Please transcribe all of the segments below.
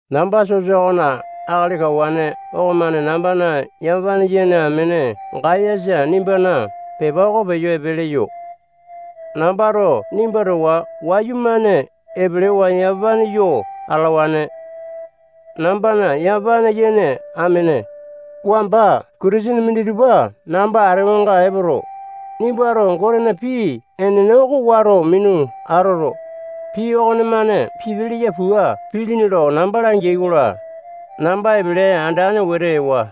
Namba sosa okona akali kawane okomane nambana yamapane yene amene Gayasa nimbana pepa oko peyo epe leyo. Nambato nimba towa wayumane epelewa yamapane yo atalawane. Nambana yamapane yene amene, wamba Kitisene minditupa namba atewanga epoto, nimbato Gotena pii enene oko wato minu atoto, pii okonemane pipe leya pua pilini lo namba langeai-kola, namba epele andane wete ewa.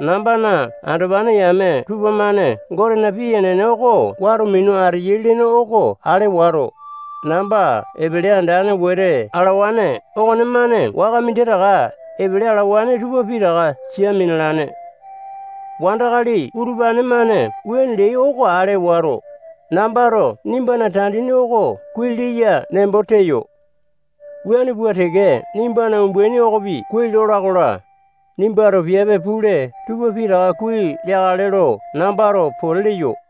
Nambana andopane yame tupamane Gotena pii enene oko wato minu ateyai lene oko ale wato, namba epele andane wete alawane okonemane waka minditaka epele alawane tupa pitaka sia minalane. Wandakali utupane-mane wuane leai oko ale wato, nambato nimbana tandini oko kuai leya nembo teyo. Wuane pua teke nimbana umbaini okopi kuai lola-kola, nimbato piape pule tupa pitaka kuai leakale lo nambato pote leyo.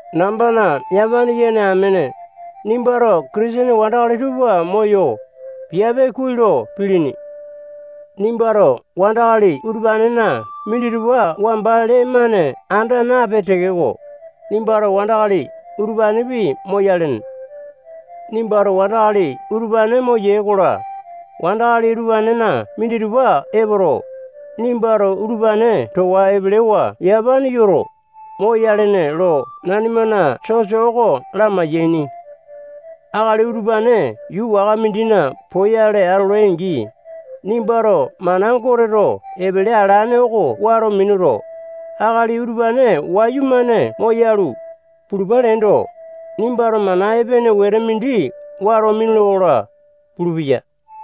Nambana yamapane yene amene, nimbato Kitisene wandakali tupa moyo, piape kuai lo pilini. Nimbato wandakali utupanena minditupa wamba lee-mane anda napee tekeko, nimbato wandakali utupanepi moyalene. Nimbato wandakali utupane moyee-kola, wandakali utupanena minditupa epoto, nimbato utupane towa epelewa yamapane yoto, moyalene lo nanimana sosa oko lamai-yaini. Akali utupane yuu waka mindina poyale atolai-angi, nimbato mana Goteto epele alane oko wato minuto, akali utupane wayumane moyalu, pulupa leendo, nimbato mana epene wete mindi wato minule-kola pulupeya.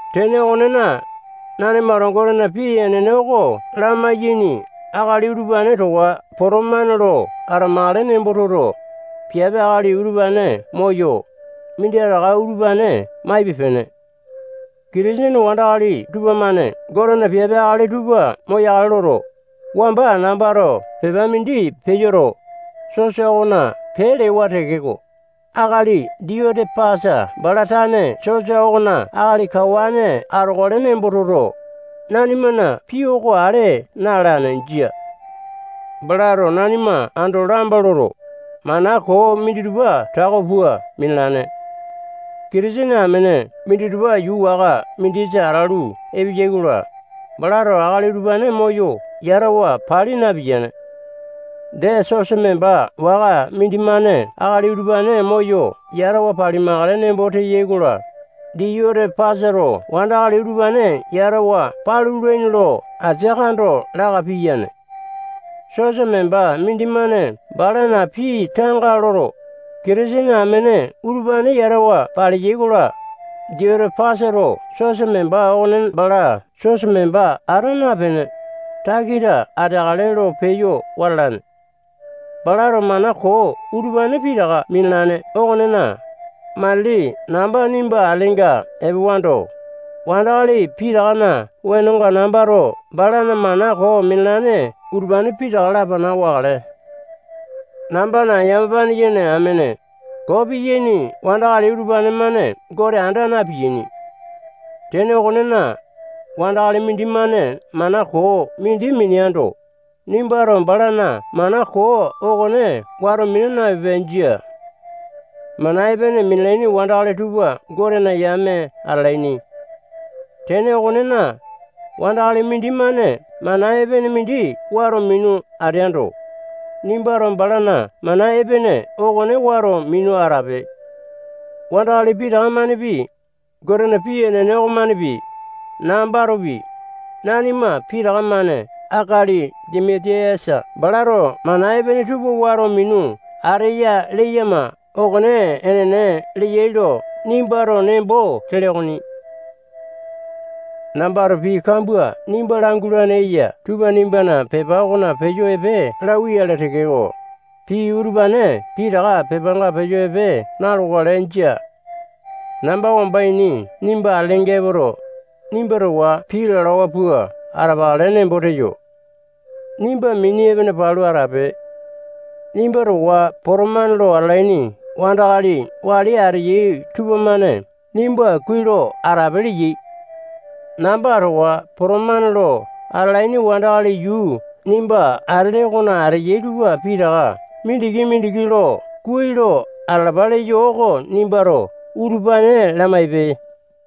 Tene okonena, nanimato Gotena pii enene oko lamayaini akali utupane towa potomane lo atamakale nembo toto, piape akali utupane moyo, minditaka utupane maipe-pene. Kitisene wandakali tupamane Gotena piape akali tupa moyakale loto, wamba nambato pepa mindi peyoto, sosa okona pee lewa tekeko, akali Diyote-pasa bala tane sosa okona akali kawane atokale nembo toto, nanimana pii oko ale na-alane. Jia. Balato nanima ando lamba loto, mana koo minditupa tako pua minalane. Kitisene amene minditupa yuu waka mindisa atalu epeyai-kola, balato akali utupane moyo yatawa pali napiyane. Dee, sosa memba waka mindimane akali utupane moyo yatawa palimakale nembo teya-kola, Diyote-pasato wandakali utupane yatawa palulaini lo asia kando laka piyane. Sosa memba mindimane balana pii tanga loto, Kitisene amene utupane yatawa palea-kola, Diyote-pasato sosa memba okone bala sosa memba ata napene, takita ateakale lo peyo wata alane. Balato mana koo utupane pitaka minalane okonena, matili namba nimba atelenga epewando, wandakali pitakana wenonga nambato balana mana koo minalane utupane pitaka lapana wakale. Nambana yamapane yene amene, koo piyaini wandakali utupane-mane Gote anda na-piyaini. Tene okonena, wandakali mindimane mana koo mindi mineando, nimbato balana mana koo okone wato mina napipe. Jia. Mana epene minalaini wandakali tupa Gotena yame atalaini. Tene okonena, wandakali mindimane mana epene mindi wato minu ateando, nimbato balana mana epene okone wato minu atape. Wandakali pitaka-manepi, Gotena pii enene okomanepi, nambatopi, nanima pitaka-mane akali Dimiti-yasa balato mana epene tupa wato minu ateya leyama okone enene leyai lo nimbato nembo tele okoni. Nambato pii kambua nimba langulane eya tupa nimbana pepa okona peyo epe lauwa-yale tekeko, pii utupane pitaka pepanga peyo epe na-lokale. Jia. Namba wamba ini nimba atelenga epoto, nimba towa pii lalawa pua atapakale nembo teyo. Nimba mini epene palu atape. Nimba towa potomane lo atalaini wandakali wali ateyai tupamane nimba kuai lo atalapape leyai. Namba towa potomane lo atalaini wandakali yuu nimba atele okona ateyai tupa pitaka mindiki-mindiki lo kuai lo atalapa leyo oko nimbato utupane lamaipe.